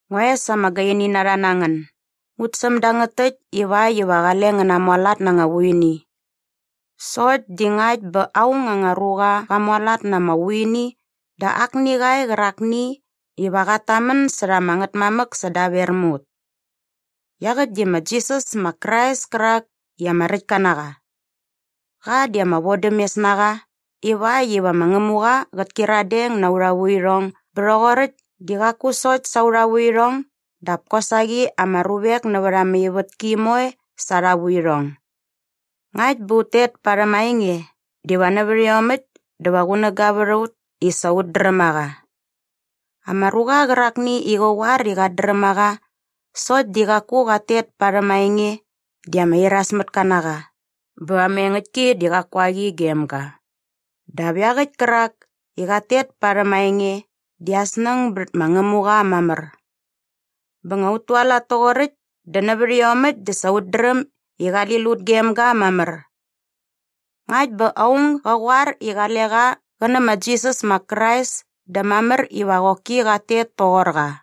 Ngua es ama gaini na rha na ngän, ngut säm dangät täkt ivakt iva qale ngän namualat na anga vuini. Sokt di ngakt bä aung anga ruqa qa mualat na ama vuini dä akni qa e qärakni iva qat tamän särha ama Ngätmamäk sädaver mä ut. Iaqäkt di ma Jisas ma Krais kärak i ama räktka na qa. Qa di ama vodämes na qa ivakt iva ma Ngämuqa qät kyiradeng na aurha vuirhong bä rhoqoräkt di qaku sokt sa aurha vuirhong dap kosaqi ama ruvek nävät ama ivätki moe sa arha vuirhong. Ngakt bä ut tet parhäm aa enge diva nävät iomäkt dä va qunäga vät a ut i sa ut dräm a qa. Ama ruqa qärakni i qä qoar i qat dräm a qa sokt di qaku qat tet parhäm aa enge di ama irasmätka na qa bä ama engäktki di qaku a qi gem ga. Dap iaqäkt kärak i qat tet parhäm aa enge di aa snäng bät ma Ngämuqa mamär. Bä nga ut tualat toqoräkt dä nävät iomäkt dä sa ut dräm i qali lut gem ga mamär. Ngakt bä aung gä qoar i qale qa qä nä ma Jisas ma Krais dä mamär iva qoki qat tet toqor qa.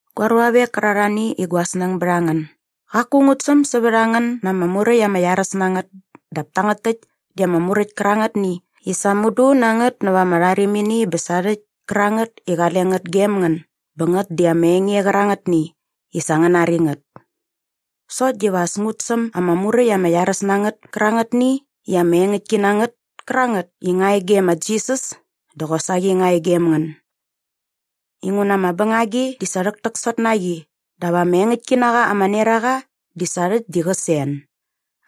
Gua ruavek kärarhani i gua snäng bät a ngän, gaku ngut säm sävät a ngän na ama muräkt ama iaräs na ngät dap tangät täkt di ama muräkt kärangätni i sa mudu na ngät nävät ama rharimini bä sarhäkt kärangät i qale ngät gem ngän bä ngät di ama enge qärangätni i sa ngän nari ngät. Sokt diva as ngut säm ama muräkt ama iaräs na ngät kärangätni i ama engäktki na ngät kärangät i nga e gem ma Jisas dä qosaqi nga e gem ngän. Inguna ama bängagi di sa rhäktäksot na qi dap ama engäktki na qa ama neraqa di sa rhäkt di qä sen.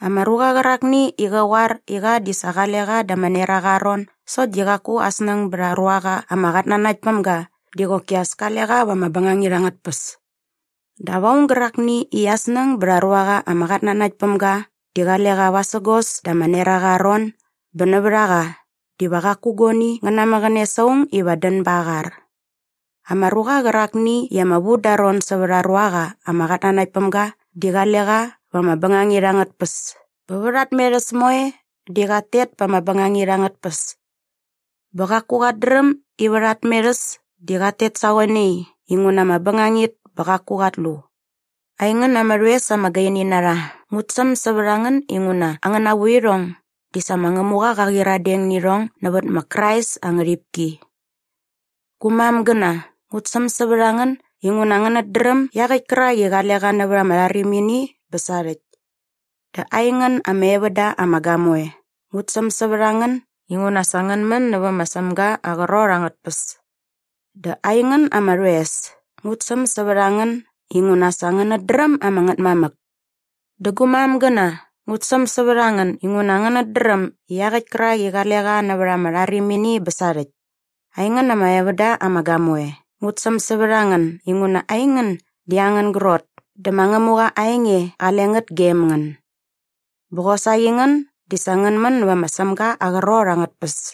Ama ruqa qärakni i qä qoar i qa di sa qale qa da ama neraqa aa ron sokt di qaku aa snäng bät aa ruaqa ama qatnanakt päm ga di qoki as kale qa va ama bängangit angät tpäs. Dap aung gärakni i aa snäng bät aa ruaqa ama qatnanakt päm ga di qale qa vasägos da ama neraqa aa ron bä nävät a qa diva qaku guani ngä namäqäne sa aung iva dän bät aa qar. Ama ruqa qärakni i ama vu da aa ron sävät aa ruaqa ama qatnanakt päm ga di qale qa va ama bängangit angät tpäs bä vät aa tmerhäs moe di qat tet pa ama bängangit angät tpäs. Bä qaku qat dräm i vät aa tmerhäs di qat tet sa qoe nai inguna ama bängangit bä qaku qat lu. Aingän ama rhoes ama gaini na rha, ngut säm sävät a ngän inguna angäna vuirhong di sa ma Ngämuqa qa qyiradeng nä irhong nävät ma Krais aa ngärhipki. Gu mamgäna, ngut säm sävät a ngän inguna ngänät dräm iaqäkt kärak i qale qa nävät ama rharimini bä sarhäkt. Dä aingän ama evän da ama gamoe, ngut säm sävät a ngän inguna sa ngän män nävä ma Sämga aa qrot angät tpäs. Dä aingän ama rhoes, ngut säm sävät a ngän inguna sa ngänät dräm ama Ngätmamäk. Dä gu mamgäna, ngut säm sävät a ngän inguna ngänät dräm iaqäkt kärak i qale qa nävät ama rharimini bä sarhäkt. Aingän ama evän da ama gamoe, ngut säm sävät a ngän inguna aingän di angän grot dä ma Ngämuqa aa enge qale ngät gem ngän. Bä qosaqi ngän di sa ngän män nävä ma Sämga aa qrot angät tpäs.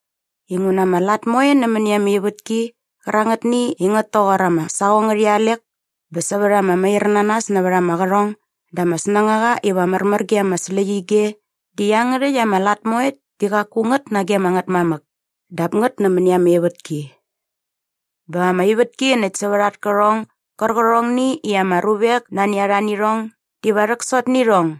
Inguna ama lat moe nämäni ama ivätki qärangätni i ngät toqor ama saqong ngärhi alek bä sävät ama mairnanas nävät ama qärhong dä ama snängaqa iva märmär ge ama släqyige di iangärhäkt ama lat moekt di qaku ngät nage ama Ngätmamäk dap ngät nämäni ama ivätki. Bä ama ivätki näkt sävät at kärhong gärqärhongni i ama ruvek nani a rha nä irhong diva rhäksot nä irhong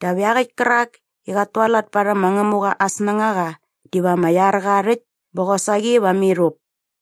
dap iaqäkt kärak i qat tualat parhäm ma Ngämuqa aa snängaqa diva ama iar qa rhäkt bä qosaqi va mirhup.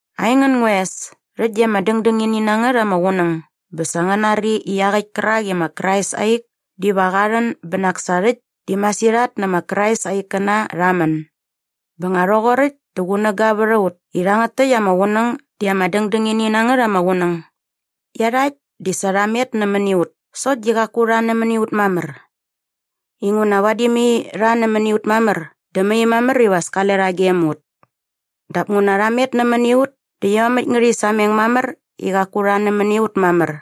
Aingän ngua es, rhäkt di ama dängdängini na ngät ama qunäng bä sa ngän nari i iaqäkt kärak i ma Krais aa ik diva qa rhän bä nak sa rhäkt di masirhat nä ma Krais aa ikkäna rha män. Bä nga rhoqoräkt dä qunäga vät a ut i rhangät täkt ama qunäng di ama dängdängini na ngät ama qunäng. Iarhakt di sa rha met nämäni ut sokt di qaku rha nämäni ut mamär. Inguna vadi mai rha nämäni ut mamär dä mai mamär iva as kale rha gem ut. Dap nguna rha met nämäni ut dä iomäkt ngärhi sameng mamär i qaku rha nämäni ut mamär.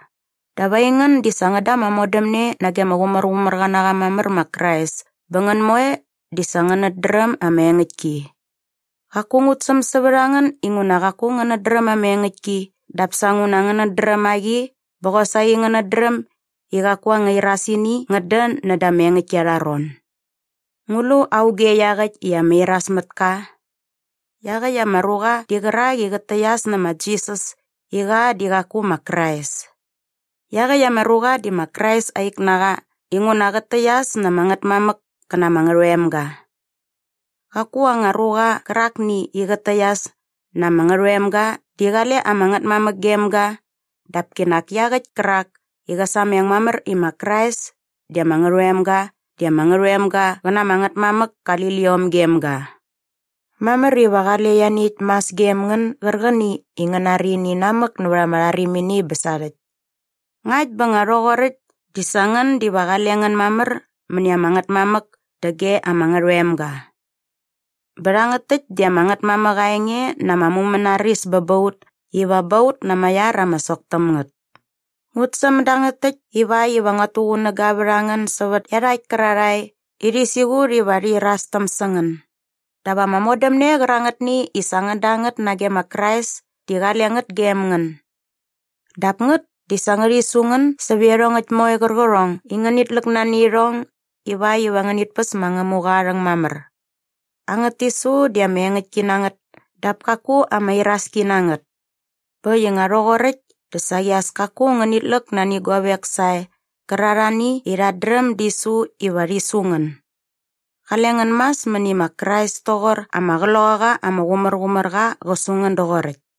Dap aingän di sa ngän da ama modämne nage ama Qumärqumärqa na qa mamär ma Krais bä ngän moe di sa ngänät dräm ama engäktki. Qaku ngut säm sävät a ngän inguna qaku ngänät dräm ama engäktki dap sa nguna ngänät dräm a qi bä qosaqi ngänät dräm i qaku anga irasini ngät dän näda ama engäktki arha ron. Ngu lu auge iaqäkt i ama irasmätka? Iaqäkt ama ruqa di qärak i qät täqyas nä ma Jisas i qa di qaku ma Krais. Iaqäkt ama ruqa di ma Krais aa ik na qa inguna qät täqyas nä ama Ngätmamäk kä na ama Ngärhoemga. Qaku anga ruqa qärakni i qät täqyas na ama Ngärhoemga di qale ama Ngätmamäk gem ga dap kinak iaqäkt kärak i qä sameng mamär i ma Krais di ama Ngärhoemga di ama Ngärhoemga qä na ama Ngätmamäk kali liom gem ga. Mamär iva qale ianiäkt mas gem ngän gärqäni i ngän nari ini namäk nävät ama rharimini bä sarhäkt. Ngakt bä nga rhoqoräkt dä sa ngän diva qale ngän mamär mäni ama Ngätmamäk dä ge ama Ngärhoemga. Bä rhangät täkt di ama Ngätmamäk aa enge na ama mumänaris bä ba ut iva ba ut na ama iar ama sok täm ngät. Ngut säm dangät täkt ivakt iva ngät tuqunäga vät a ngän sävät iarhakt kärarhae i rhi siqut iva rhi irastäm sä ngän. Dap ama modämne qärangätni i sa ngän da ngät nage ma Krais di qale ngät gem ngän. Dap ngät di sa ngärhi su ngän sävät iarhongäkt moe qärqärhong i ngänit läk nani irhong ivakt iva ngänit päs ma Ngämuqa aa rhäng mamär. Angät tisu di ama engäktki na ngät dap kaku ama iraski na ngät. Bä äkt i nga rhoqoräkt dä saqi as kaku ngänit läk nani guavek sae qärarhani i rhat dräm di su iva rhi su ngän. Qale ngän mas mäni ma Krais toqor ama Qloqaqa ama Qumärqumärqa qä su ngän doqoräkt.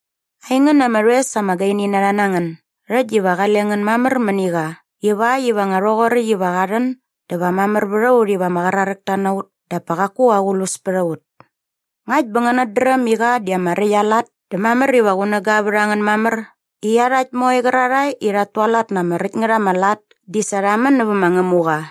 Aingän ama rhoes ama gaini na rha na ngän, rhäkt diva qale ngän mamär mäni qa ivakt iva nga rhoqoräkt iva qa rhän dä va mamär vät a ut iva ama qraräkta na ut dap pa qaku aqlus pät a ut. Ngakt bä ngänät dräm i qa di ama räkt aa lat dä mamär iva qunäga vät a ngän mamär i iarhakt moe qärarhae i rhat tualat na ama räkt ngät ama lat di sa rha män nävä ma Ngämuqa.